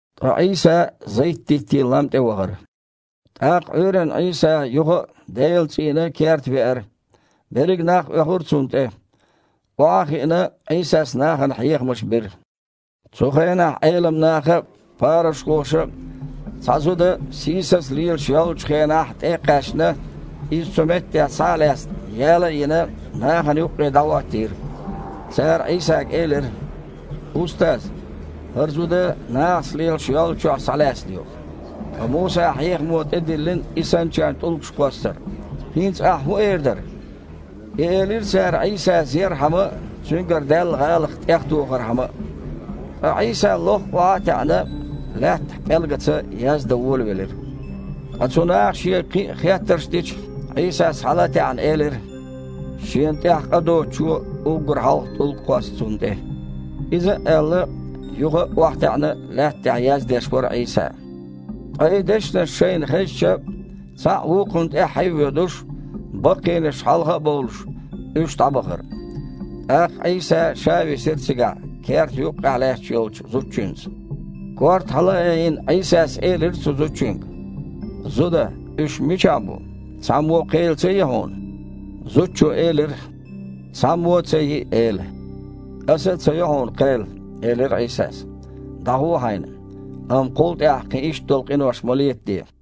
Ткъа Іийса Зайт-диттийн лам тІе вахара. ТІаккха Іуьйранна Іийса юха а Делан цІийнан керта веара. Берриг нах оьхура Цунна тІе. Охьа а хиъна, Іийсас нахана хьехамаш бира. Цу хенахь Іелам наха а, парушхоша а цхьа зуда, сийсаза лелаш йоллучу хенахь тІе а кхаьчна, иза цу меттехь схьа а лаьцна, яла а йина, нахана юккъе дІахІоттийра. Цара Іийсага элира: «Устаз! ХІара зуда нахаца лелаш йоллучохь схьалаьцна ю. Ткъа Мусан хьехамо тІедиллина и санначарна тІулгаш кхоссар. ХІинца Ахь хІун эр дара?» И элира цара Іийса зерхьама а, Цуьнгара даьлла гІалат тІехтохархьама а. Ткъа Іийса, лохха охьа а таьІна, лаьттахь пІелгаца яздан волавелира. Ткъа цу наха Шега кхин а хеттарш дича, Іийсас, хьала а таьІна, элира: «Шена тІехь къа доцучо уггар хьалха тІулг кхосса цунна тІе». Иза а аьлла, юха а охьатаьІна, лаьтта тІехь яздеш вара Іийса. Ткъа и дешнаш шайна хезча, цхьаъ вукхунна тІаьххье а воьдуш, баккхийнаш хьалха а бовлуш, уьш дІабахара. ТІаккха Іийса Ша висира цигахь, керта юккъехь лаьтташ йолчу зудчуьнца Корта хьала а айина, Іийсас элира цу зудчуьнга: «Зуда, уьш мичахь бу? Цхьаммо а кхел ца йи хьуна?» Зудчо элира: «Цхьаммо а ца йи, Эла». «Аса а ца йо хьуна кхел, – элира Іийсас. – ДІагІо хьайна, амма кхул тІаьхьа кхин иштта долу къинош ма летаде».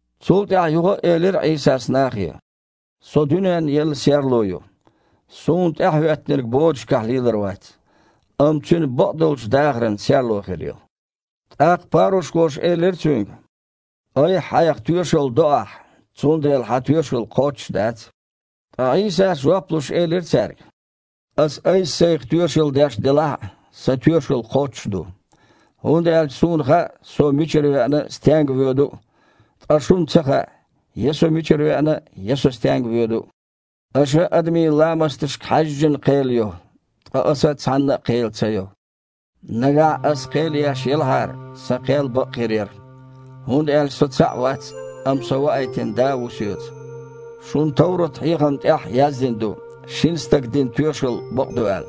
Цул тІаьхьа юха а элира Іийсас нахе: «Со дуьненна елла серло ю. Суна тІаьхьахІоьттинарг бодашкахь лелар вац, амма цуьнан бакъдолчу дахаран серло хир ю». ТІаккха парушхоша элира Цуьнга: «Айхьа-Хьайх тоьшалла до Ахь, цундела Хьан тоьшалла кхоччуш дац». Ткъа Іийсас, жоп луш, элира цаьрга: «Аса Айса-Сайх тоьшалла деш делахь а, Сан тоьшалла кхоччуш ду. ХІунда аьлча Суна хаьа, Со мичара веана а, стенга воьду а, ткъа шуна ца хаьа, я Со мичара веана а, я Со стенга воьду а. Аша адамийн ламасташка хьаьжжина кхел йо, ткъа Аса цхьанна а кхел ца йо. Нагахь Ас кхел еш елахьара, Сан кхел бакъ хир яра, хІунда аьлча Со цхьаъ вац, амма Со ваийтина Да а ву Соьца. Шун товрат-хьехамна тІехь а яздина ду, шина стага дина тоьшалла бакъ ду аьлла.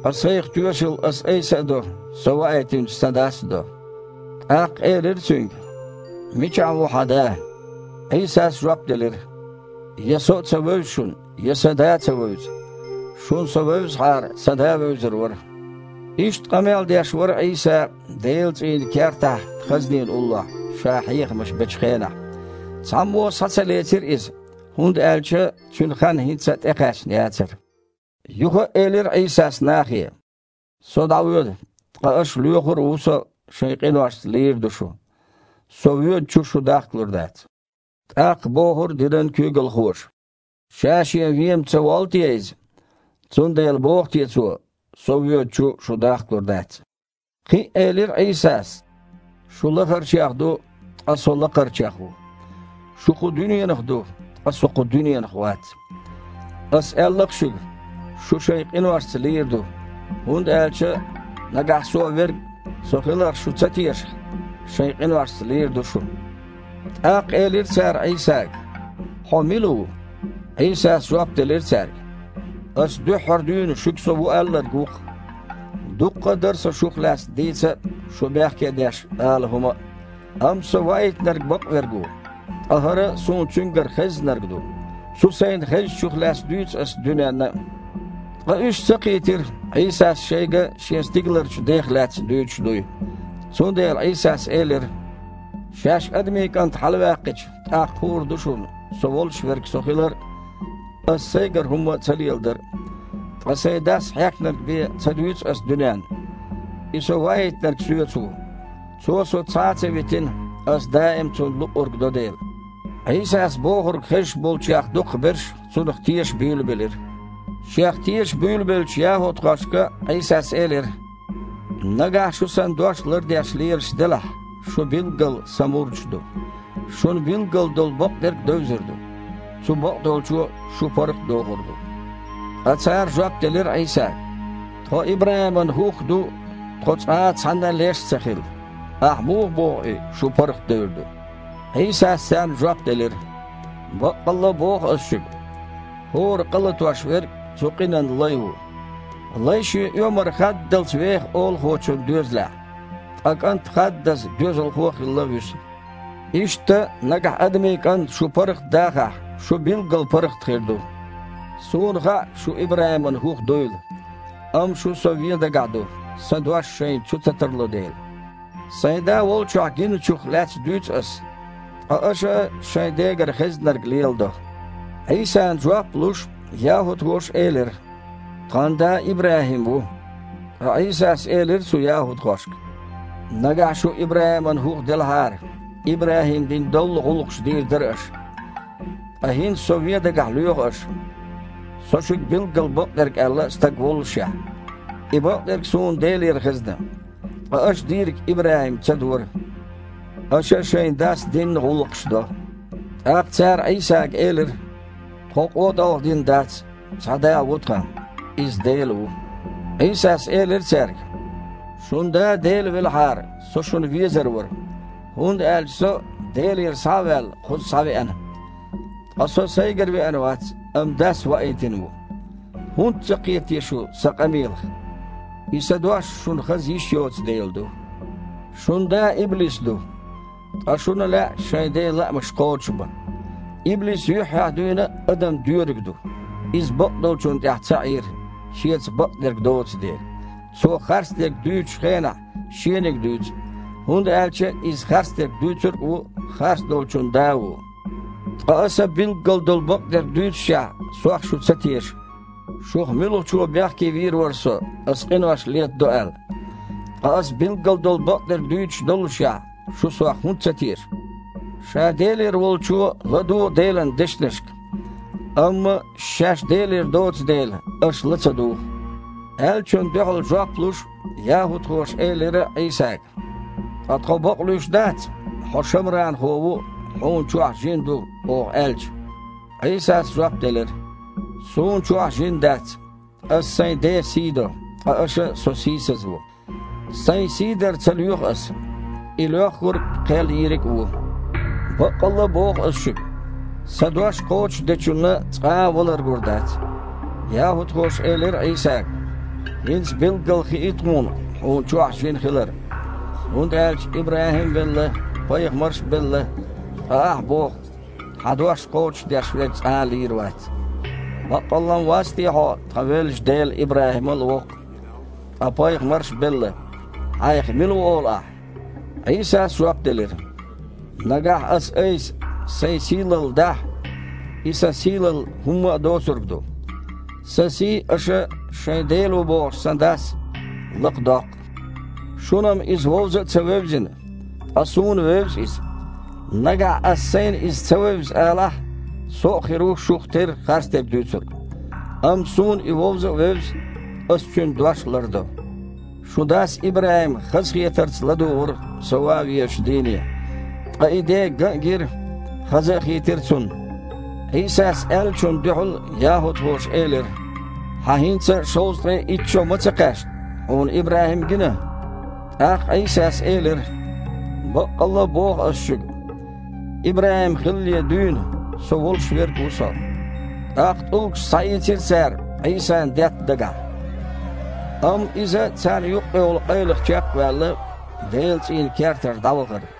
Ткъа Сайх тоьшалла Ас-Айса а до, Со ваийтинчу Сан Дас а до». ТІаккха элира Цуьнга: «Мичахь ву Хьан Да?» Іийсас жоп делира: «Я Со а ца вевза шуна, я Сан Да а ца вевза. Шуна Со вевзахьара, Сан Да а вевзар вара». Иштта къамел деш вара Іийса Делан цІийнан кертахь хазнина уллохь, Ша хьехамаш бечу хенахь. Цхьаммо а схьа ца лецира Иза, хІунда аьлча Цуьнан хан хІинца а тІекхаьчна яцара. Юха а элира Іийсас нахе: «Со дІавоьду, ткъа аша лоьхур а ву Со, шайн къиношца лийр а ду шу. Со воьдучу шу дахкалур дац». ТІаккха бохура динан куьйгалхоша: «Ша-Шен вен-м ца воллу те Иза? Цундела боху те Цо: „Со воьдучу шу дахкалур дац“?» Кхин а элира Іийсас: «Шу лахарчех ду, ткъа Со лакхарчех ву. Шу кху дуьненах ду, ткъа Со кху дуьненах вац. Ас аьлла-кх шуьга, шу шайн къиношца лийр ду, хІунда аьлча, нагахь Суо Верг Со хиларх шу ца тешахь, шайн къиношца лийр ду шу». ТІаккха элира цара Іийсага: «Хьо мила ву?» Іийсас жоп делира цаьрга: «Аса дуьххьара дуьйна шуьга Со ву аьлларг ву-кх. Дуккха а дара Сан шух лаьцна дийца а, шу бехке а деш, ала хІума а. Амма Со Ваийтинарг бакъверг ву, ткъа хІара Суна Цуьнгара хеззнарг ду. Цу Сайна хезначух лаьцна дуьйцу Ас дуьненна а». Ткъа уьш ца кхийтира, Іийсас шайга Шен стигаларчу Дех лаьцна дуьйцуш дуй. Цундела Іийсас элира: «Шаьш Адамийн КІант хьалаваьккхича, тІаккха хуур ду шуна Со волуш Верг Со хилар а, Аса Сайгара хІума ца леладар а. Ткъа Сайн Дас хьехнарг бен ца дуьйцу Ас дуьненна. И Со Ваийтинарг Соьца ву. Цо Со цхьа ца витина, Ас даим а Цунна луъург до дела». Іийсас бохург хезаш болчех дукхахберш Цунах теша буьйлабелира. Шех теша буьйлабеллачу яхІудхошка Іийсас элира: «Нагахь шу Сан дош лардеш лелаш делахь, шу билггал Сан мурдаш ду. Шуна билггал долу бакъдерг а девзар ду, цу бакъдолчо шу паргІат а дохур ду». Ткъа цара жоп делира Іийсага: «Тхо ИбрахІиман хІух а ду, тхо цкъа а цхьанна а леш ца хилла. Ахь муха боху и: „Шу паргІатдевр ду“?» Іийсас царна жоп делира: «Баккъалла а боху Ас шуьга: хІора къа латош верг цу къинан лай ву. Лай шен оьмар хаддалц веха олахочун доьзалехь, ткъа кІант хаддаза доьзалхо хилла вуьсу. Иштта, нагахь Адамийн КІанта шу паргІатдахахь, шу билггал паргІат хир ду. Суна хаьа шу ИбрахІиман хІух дуйла, амма шу Со вен дагахь ду, Сан дош шайна чу ца тарло дела. Сайн Да волчохь гинначух лаьцна дуьйцу Ас, ткъа аша а шайн дегара хеззнарг леладо». Іийсана жоп а луш, яхІудхоша элира: «Тхан да ИбрахІим ву». Ткъа Іийсас элира цу яхІудхошка: «Нагахь шу ИбрахІиман хІух делахьара, ИбрахІима дина доллу гІуллакхаш дийр дара аша. Ткъа хІинца Со вен дагахь лоьху аш, Со шуьга билггал бакъдерг аьлла Стаг воллушехь. И бакъдерг Суна Делера хезна. Ткъа аш дийриг ИбрахІима ца дора. Аша шайн дас динна гІуллакхаш до». ТІаккха цара Іийсага элира: «Тхо къотІалгІадина дац. Цхьа Да ву тхан. Иза Дела ву». Іийсас элира цаьрга: «Шун Да Дела велахьара, Со шуна везар вара, хІунда аьлча Со, Делера схьа а ваьлла, кхуза схьавеана. Ткъа Со Сайгара веана вац, амма Дас ваийтина ву. ХІунда ца кхета те шу Сан къамелах? Иза сан дош шуна хаза йиш йоцу дела ду. Шун да иблис ду, ткъа шуна а лаьа шайн ден лаамаш кхочушбан. Иблис юьххьехь дуьйна а адам доьриг ду, иза бакъдолчунна тІехь ца Іийра, шеца бакъдерг доцу дела. Цо харцдерг дуьйцучу хенахь шениг дуьйцу, хІунда аьлча иза харцдерг дуьйцург а ву, харцдолчун да а ву. Ткъа Аса билггал долу бакъдерг дуьйццушехь, Сох шу ца теша. Шух муьлхачо бехке вийр вара Со, Ас къинош летадо аьлла? Ткъа Ас билггал долу бакъдерг дуьйцуш доллушехь, шу Сох хІунда ца теша? Ша Делера Волчо ладугІу Делан дешнашка. Амма шаьш Делера доцу дела, аша ла а ца дугІу». Аьллачунна дуьхьал жоп луш, яхІудхоша элира Іийсага: «Ткъа тхо бакъ луьйш дац: „Хьо шамранхо ву, Хьуна чохь жин ду“, – оха аьлча?» Іийсас жоп делира: «Суна чохь жин дац. Аса Сайн Ден сий до, ткъа аша Со сийсазво. Сайн сий дар ца лоьху Ас. И Лоьххург – кхел Йийриг а ву. Баккъалла а боху Ас шуьга: Сан дош кхочушдечунна цкъа а валар гур дац». ЯхІудхоша элира Іийсага: «ХІинца билггал хии тхуна Хьуна чохь жин хилар. ХІунда аьлча ИбрахІим а велла, пайхамарш а белла, ткъа Ахь боху, Хьан дош кхочушдеш верг цкъа а лийр вац. Баккъалла-м вац те Хьо тхан веллачу дел ИбрахІимал а воккха? Ткъа пайхамарш а белла. Хьайх мила ву олу Ахьа?» Іийсас жоп делира: «Нагахь Ас-Айса Сайн сийлалла дахь, и Сан сийлалла хІумма а доцург ду. Сан сий аша шайн Дела ву бохучу Сан Дас лакха доккху. Шуна-м Иза вовза а ца вевзина, ткъа Суна вевза Иза. Нагахь Ас Сайна Иза ца вевза алахь, Со а хир ву шух терра харцдерг дуьйцург. Амма Суна И вовза а вевза, Аса Цуьнан дош а лардо. Шун дас ИбрахІима хазахетарца ладугІура Со ван везачу дийне, ткъа и де ган а гира, хаза а хийтира цунна». Іийсас аьллачунна дуьхьал яхІудхоша элира: «Хьан хІинца а шовзткъе итт шо а ма ца кхаьчна? Хьуна ИбрахІим гина?» ТІаккха Іийсас элира: «Баккъалла а боху Ас шуьга: ИбрахІим хилале дуьйна, Со волуш Верг ву Со». ТІаккха тІулгаш схьаийцира цара Іийсана детта дагахь. Амма Иза, царна юккъехула къайлаха чекх а ваьлла, Делан цІийнан кертара дІавахара.